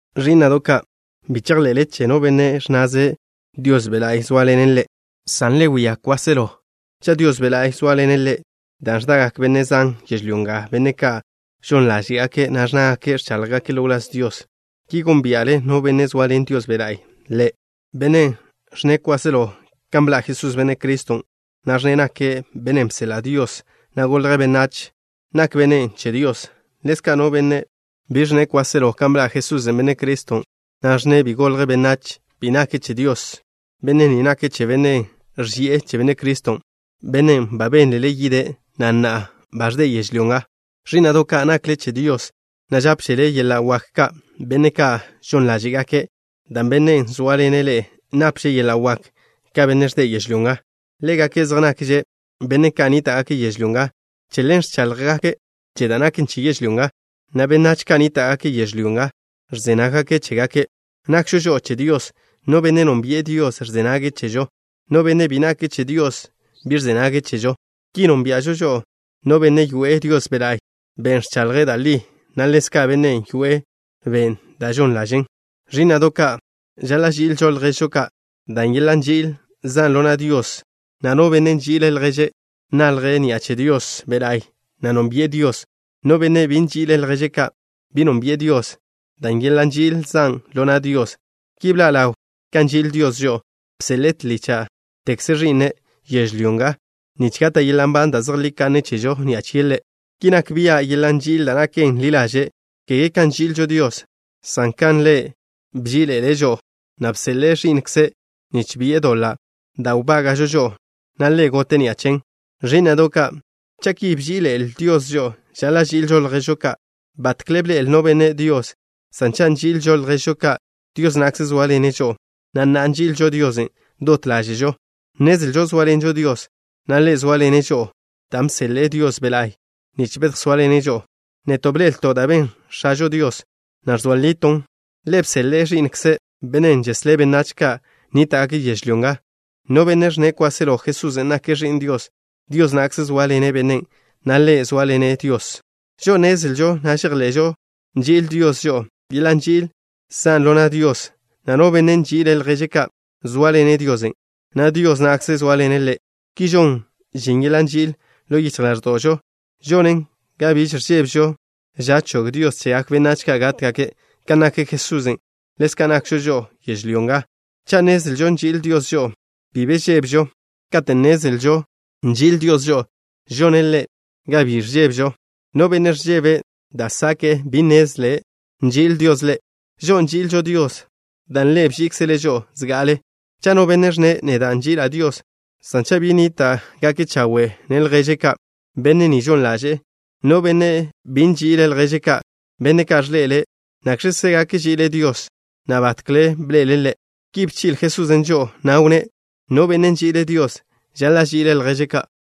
Ẕí'na'do' ka', bi chejḻe'le che no benne' ẕnnaze' Dios Be' La'y zóaḻene' ḻe', san le si' bia' bennen', cha' Dios Be' La'y zóaḻene' ḻe', dan' ẕdagak benne' zan yežlyó nga, benne' ka' žon ḻáže'gake', na' ẕnnágake' ẕcháḻjgake' ḻo wláz Dios. Ki gónbia'le no benne' zoaḻen Dios Be' La'y ḻe'. Bennen' ẕnne' kwáselo kan bḻa' Jesús, Benne' Criston', na' ẕnne' nake' Bennen' bseḻa' Dios, na' golje' benách, nak bennen' che Dios. Ḻezka', no benne' bi ẕnne' kwáselo kan bḻa' Jesús, Benne' Criston', na' ẕnne' bi golje' benách, bi nake' che Dios. Benne' ni nake' che bennen' ẕži'e che Benne' Criston', bennen' ba bénlele yide', na' na'a ba ẕde' yežlyó nga. Ẕí'na'do' ka', nakle che Dios, na' nápžele yeḻa' wak ka benne' ka' žon ḻáže'gake', dan' Bennen' zóaḻene' ḻe'e napže' yeḻa' wak ka bennen' ẕde' yežlyó nga. Ḻégake' zej nakze' benách ka' nníta'gake' yežlyó nga. Che ḻen ẕcháḻjgake' che da' naken che yežlyó nga, na' benách ka' nníta'gake' yežlyó nga ẕze nággake' chégake'. Nakžo žo'o che Dios. No benne' nónbi'e Dios ẕze nage' chežo. No benne' bi nake' che Dios bi ẕze nage' chežo. Ki nónbia'žo no bennen' yoe'e Dios Be' La'y, Ben' ẕchaḻje' da' li, na' ḻezka' bennen' yoe'e ben' da' žon ḻažen'. Ẕí'na'do' ka', žaḻa' ži'ilžo lježžo ka', dan' yeḻa' nži'il zan' ḻo na' Dios, na' no benne' nži'ile' lježe' ka' nalje' ni'a che Dios Be' La'y, na' nónbi'e Dios. No benne' bi nži'ile' lježe' ka', bi nónbi'e Dios, dan' yeḻa' nži'il zan' ḻo na' Dios. Ki bḻa' ḻaw kan nži'il Dios žo'o. Bseḻe'e tlícha'tekze Ẕi'ne' yežlyó nga, nich gata' yeḻa' nban da' zejlí kanne chežo ni'a chie' Ḻe'. Ki nak bia' yeḻa' nži'il da' naken ḻi ḻaže', kege kan nži'ilžo Dios, san kan Ḻe' bží'iḻe'ele' žo'o, na' bseḻe'e Ẕi'nkze' nich bi'e doḻa' da' wbága'žo žo'o, na' Ḻe' gote' ni'a chen. Ẕí'na'do' ka', cha' ki bží'iḻe'ele Dios žo'o, žaḻa' ži'ilžo lježžo ka'. Batkle bḻe'el no benne' Dios, san cha' nži'ilžo lježžo ka', Dios na'kze zóaḻene' žo'o, na' na'a nži'ilžo Diosen' dot ḻáže'žo. Nnezlžo zóaḻenžo Dios, na' Ḻe' zóaḻene' žo'o, dan' bseḻe'e Dios Be' La'y, nich bedjsóaḻene' žo'o. Neto' bḻe'elto' da' ben X̱ažo Dios, na' ẕzoa liton'. Ḻe' bseḻe'e Ẕi'nkze', Bennen' žeslé' benách ka' nníta'gake' yežlyó nga. No benne' ẕnne' kwáselo Jesusen' nake' Ẕi'n Dios, Dios na'kze zóaḻene' bennen', na' ḻe' zóaḻene' Diosen'. Žo'o nnezlžo, na' žejḻe'žo nži'il Dios žo'o. Yeḻa' nži'il zan' ḻo na' Dios, na' no benne' nži'ile' lježe' ka', zóaḻene' Diosen', na' Dios na'kze zóaḻene' ḻe'. Ki žon žin yeḻa' nži'il ḻo yichj ḻáẕdo'žo. Žonen ga biž ẕžébežo ža chog Dios chegak benách ka' gátgake'. Kan nak Jesusen', ḻezka' nakžo žo'o yežlyó nga. Cha' nnezlžo nži'il Dios žo'o, bi be ẕžébežo. Kate' nnezlžo nži'il Dios žo'o, žone' Ḻe' ga bi ẕžébežo. No benne' ẕžebe' da' sake'e bi nnezle' nži'il Dios ḻe'. Žo'o nži'ilžo Dios, dan' Ḻe' bží'ikzele' žo'o zga'ale'. Cha' no benne' ẕnne': “Neda' nži'ila' Dios” san cha' bi nape' lježe' ka' chawe', benne' ni žon ḻaže'e. No benne' bi nži'ile' lježe' ka', benne' ka' ẕḻe'ele', ¿nakx̱kze gak ži'ile' Dios, na' batkle bḻe'ele' Ḻe'? Ki bchi'le Jesusen' žo'o, na' wnné': “No benne' nži'ile' Dios, žaḻa' ži'ile' lježe' ka'.”